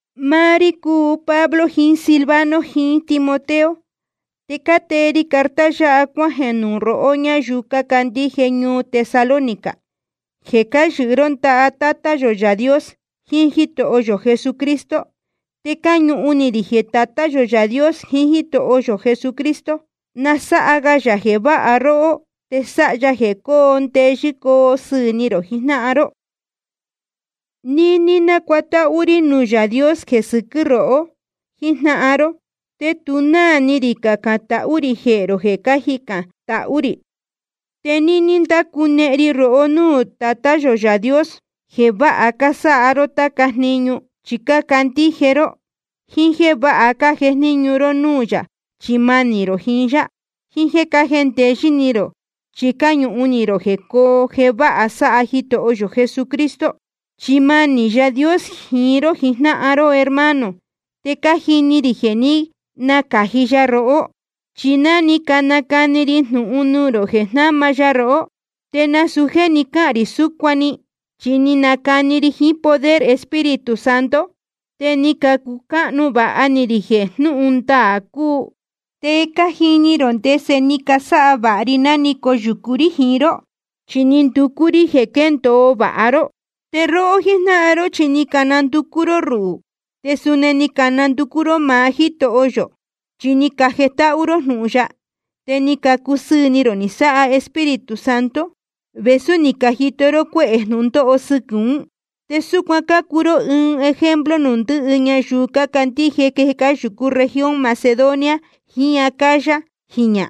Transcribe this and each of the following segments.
Máá rí cúu Pablo jiín Silvano jiín Timoteo, te cátee ri carta yáha cuájeē nuū rohó ñáyuu cácandíje ñuu Tesalónica, jeē cáyɨhɨ ró ndaha Tátá yō Yaā Dios jiín Jítoho yō Jesucristo. Te cáñuhun ni rī jeē Tatá yō Yaā Dios jiín Jítoho yō Jesucristo, na sáha ga yā jeē váha róhó, te sáha ya jeē coo ndeyɨ́ coo sɨɨ̄ ni rō jijnáhan ró. Níní cánacuatáhú rí nuū Yaā Dios jeē sɨquɨ́ rohó jíjnáhan ró, te tu náā ni rī cacān tahú rī jehē rō jeē cájicān tahú rī. Te níní ndácunehen ri rohó núū Tatá yō Yaā Dios, jeē váha cásáha ró táca jniñu chi cácandíje ró, jíín jéē váha cájejníñu ró núū yā chi manī rō jiín yá, jíín jéē cájendeyɨ́ ni rō chi cáñuhun ni rō jeē coo jeē váha sáha Jitoho yō Jesucristo. Chi manī Yaā Dios jiín ró jíjnáhan ró hermano, te cájini rī jeē ní nacāji ya rohó. Chi ná ni canacani ri jnūhun nuū rō jeē jnáma ya rohó, te nasūu jéē ni cáhān rī súcuan‑ni, chi ni nacani ri jiín poder Espíritu Santo, te ni cacucáhnu vāha ni rī jeē jnúhun ndaā cúu. Te cájini rō ndese ni casáha vāha ri ná ni coyūcu rí jiín ró, chi ni nducú rí jeē quéndōo vāha ró. Te róhó jíjnáhan ró chi ni candacu ró rúhū, te suni ni candacu ró máá Jítoho yō. Chi ni cajetáhú ró jnūhun ya, te ni cacusɨɨ̄ ni rō ni sáha Espíritu Santo, vēsú ni cajito ró cuehē jnūndóho sɨquɨ̄ ún. Te súcuan cácuu ró ɨɨn ejemplo nuū ndɨhɨ ñayuu cácandíje jeē cáyūcú región Macedonia jiín Acaya jiñā.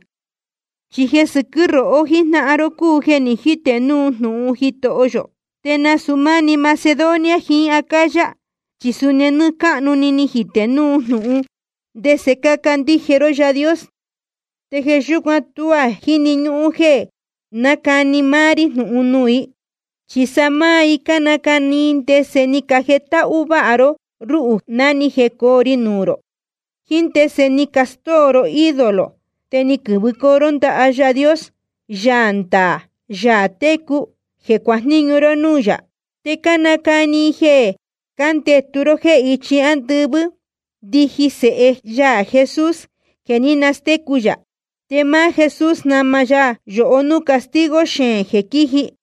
Chi jeē sɨquɨ́ rohó jíjnáhan ró cúu jeē ní jite núu jnūhun Jítoho yō, te nasūu máni Macedonia jiín Acaya, chi suni nɨ́ɨ́ cáhnu‑ni ni jitē núu jnūhun ndese cácandíje ró Yaā Dios. Te jeē yúcuan tuá jíni ñúhún jeē nácani máá rí jnūhun nuū i. Chi sa máá i cánacani ndese ni cajetáhú váha ró rúhū ná ni jecoo ri nuū rō, jíín ndese ni castóo ro ídolo te ni quɨ̄vɨcoo ró ndaha Yaā Dios, Yaā ndaā Yaā técu, jeē cuajníñu ró núū yā. Te cánacani i jeē cándetu ró jéē ichi ándɨvɨ́ ndiji Sēhe ya Jesús jeē ní nastécu yā. Te máá Jesús jnama ya yohó núū castigo xeēn jeē quíji.